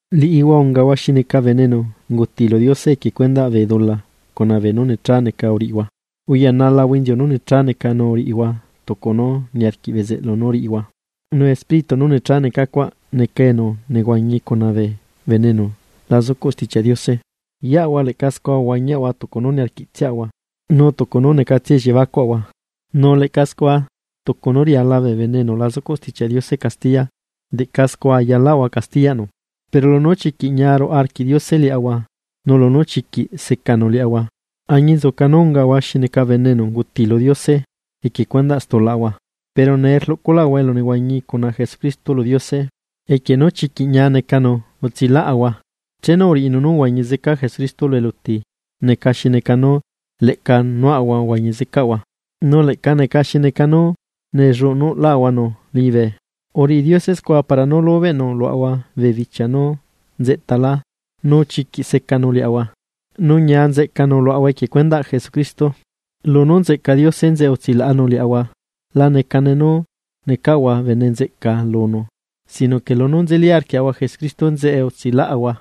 Liꞌihua ungahua xi neca bene enu unguti lu Diose equie cuendaꞌ bee dula cuna beenú necha neca uriꞌihua, uyanalahua inziu nú necha neca nu uriꞌihua tucu nú niarquiꞌ bezeꞌlu nú riꞌihua, nu espíritu nú necha neca cuaꞌ neca enu nehuañi cuna bee bene enu la zucuꞌ Stichiaꞌ Diose. Yeꞌahua leꞌca scua uhuañiaꞌahua tucu nú niarquiꞌtsiaꞌahua, nu tucu nú necatsia elliebacuaꞌahua. Nu leꞌca scua tucu nú riala bee bene enu la zucuꞌ Stichiaꞌ Diose castiya, leꞌca scua ayalaꞌahua castiyaꞌnu. Pero lunú chiquiꞌ ñia ruaꞌa arquiꞌ Diose liaꞌahua, nu lunú chiquiꞌ secanu liaꞌahua, añinzuca nú ungaꞌahua xi neca bene enu unguti lu Diose, equie cuendaꞌ stulaꞌahua, pero nee rluꞌculaꞌahua elunehuañi cuna Jesucristo lu Diose. Equie nú chiquiꞌ ñia necanu utsilaꞌahua. Chenu uriꞌinu nú uhuañi zeca Jesucristo lu eluti neca xi neca nú leꞌca nuaꞌahua uhuañi zecaꞌahua, nu leꞌca neca xi neca nú nellunuꞌlaꞌahuanu liñibe. Uriꞌi Diose scua para nú lubeꞌnu luaꞌahua bee bichia nú nzeꞌtalá nu chiquiꞌ secanu liaꞌahua nu ñia nzeꞌcanu luaꞌahua equie cuendaꞌ Jesucristo. Lunú nzeꞌca Diose enzeꞌe utsilaꞌanu liaꞌahua, la necane nu necaꞌahua bene nzeꞌca lunu, sino que lunú nzeli arquiaꞌahua Jesucristo enzeꞌe utsilaꞌahua.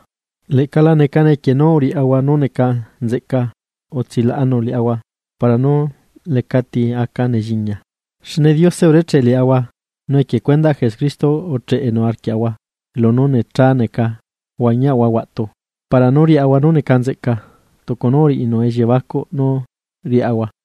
Leꞌca la necane equie nu uriaꞌahua nú neca nzeꞌca utsilaꞌanu liaꞌahua para nú lecati aca nelliña. Xne Diose urecheꞌ liaꞌahua, nu equie cuendaꞌ Jesucristo ucheꞌenu arquiaꞌahua lunú necha uhuañiaꞌahua huaꞌtu para nú riaꞌahua nú neca nzeꞌca, tucu nú uriꞌinu elliebacuꞌ nú riaꞌahua.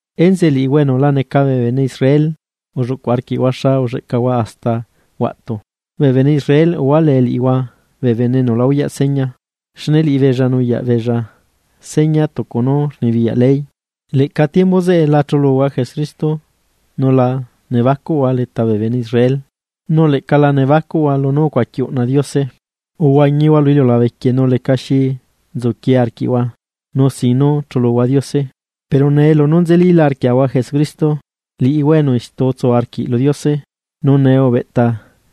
Enzeꞌe liꞌihua enu la neca bee bene Israel ulluꞌcu arquiꞌhua xa ulleꞌcahua hasta huaꞌtu. Bee bene Israel uhualee liꞌihua bee bene enu la uyaꞌ seña, xne liꞌibeella nuyaꞌbeella seña tucu nú rnibiyaꞌ ley, leꞌca tiembu zeꞌe la chuluhua Jesucristo, nu la nebacuꞌhua leta bee bene Israel, nu leꞌca la nebacuꞌhua lunú ucuaqui uꞌna Diose. Uhuañihua lu iliulabe quieꞌ nu lecaxi nzuquie arquiꞌhua nu sin nú chuluhua Diose. Pero nee nú nzelila arquiaꞌahua Jesucristo, liꞌihua enu istu utsu arquiꞌ lu Diose, nu nee ubeꞌta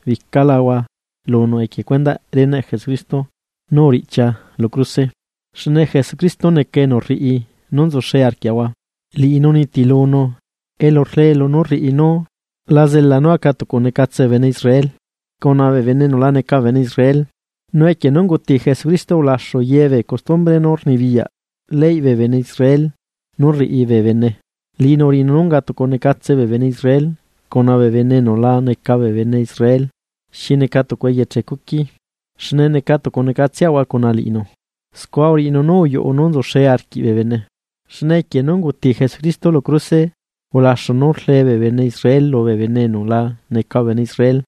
bicalahua lunu equie cuendaꞌ reneꞌ Jesucristo nú uriꞌchia lu cruse. Xne Jesucristo neca enu rriꞌi nú nzuxe arquiaꞌahua. Liꞌinu unitilunu elu rlee lunú rriꞌi nú la zela nú aca tucunecatse bee bene Israel cuna bee bene enu la neca bee bene Israel. Nu equie nú unguti Jesucristo ulaxu yebee custumbre nú rnibiyaꞌ ley lubee bene Israel nú rriꞌi beella, liꞌinu uriꞌinu nú unga tucunecatse bee bene Israel cuna bee bene enu la neca bee bene Israel xi neca tucu eyeche cuqui, xne neca tucunecatseꞌahua cuna liꞌinu. Scua uriꞌinu nú uyuꞌu nú nzuxe arquiꞌ bee bene. Xne equie nú unguti Jesucristo lu cruse, ulaxu nú rlee bee bene Israel lubee bene enu la neca bee bene Israel,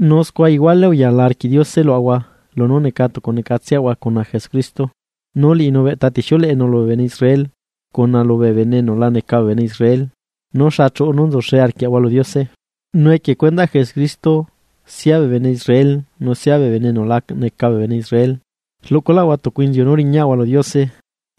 nu scua iguale uyala arquiꞌ Diose luaꞌahua lunú neca tucu necatseꞌahua cuna Jesucristo. Nu liꞌinu ubeꞌta tixiuleꞌenu lubee bene Israel cuna lubee bene enu la neca bee bene Israel nú xa chuꞌu nú nzuxe arquiaꞌahua lu Diose. Nu equie cuendaꞌ Jesucristo sia bee bene Israel nu sia bee bene enu la neca bee bene Israel, rluꞌculaꞌahua tucu inziu nú riñaꞌahua lu Diose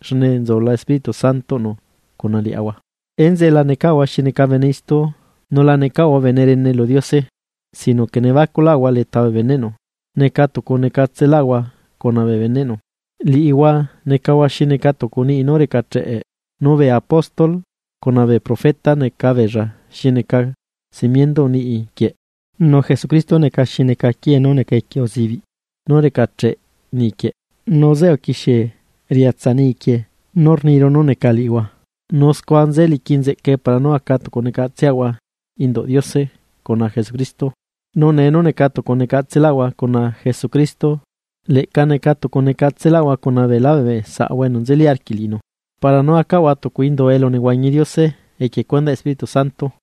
xne nzula Espíritu Santoꞌnu cuna liaꞌahua. Enzeꞌe la necaꞌhua xi neca bene istu nu la necaꞌhua bene rene lu Diose sino que nebacuꞌlahua leta bee beneꞌnu, neca tucunecatselaꞌahua cuna bee beneꞌnu. Liꞌihua necahua xi neca tucu niꞌi nú recacheꞌe, nu bee apóstol cuna bee profeta neca beella xi neca cimienduꞌ niꞌi quieꞌ, nu Jesucristo neca xi neca quiee nú neca equie uzibiꞌ nú recacheꞌ niꞌi quieꞌ. Nu zeꞌe uquixie riatsa niꞌi quie nú rniru nú neca liꞌihua, nu scua nze liqui nzeꞌcae para nú aca tucu necatseꞌahua induꞌ Diose cuna Jesucristo. Nu nee nú neca tucu necatselahua cuna Jesucristo, leꞌca neca tucu necatselahua cuna beela bee saꞌahua enu nzeli arquiꞌ liꞌinu para nú acaꞌahua tucu indu elu nehuañi Diose equie cuendaꞌ Espíritu Santo.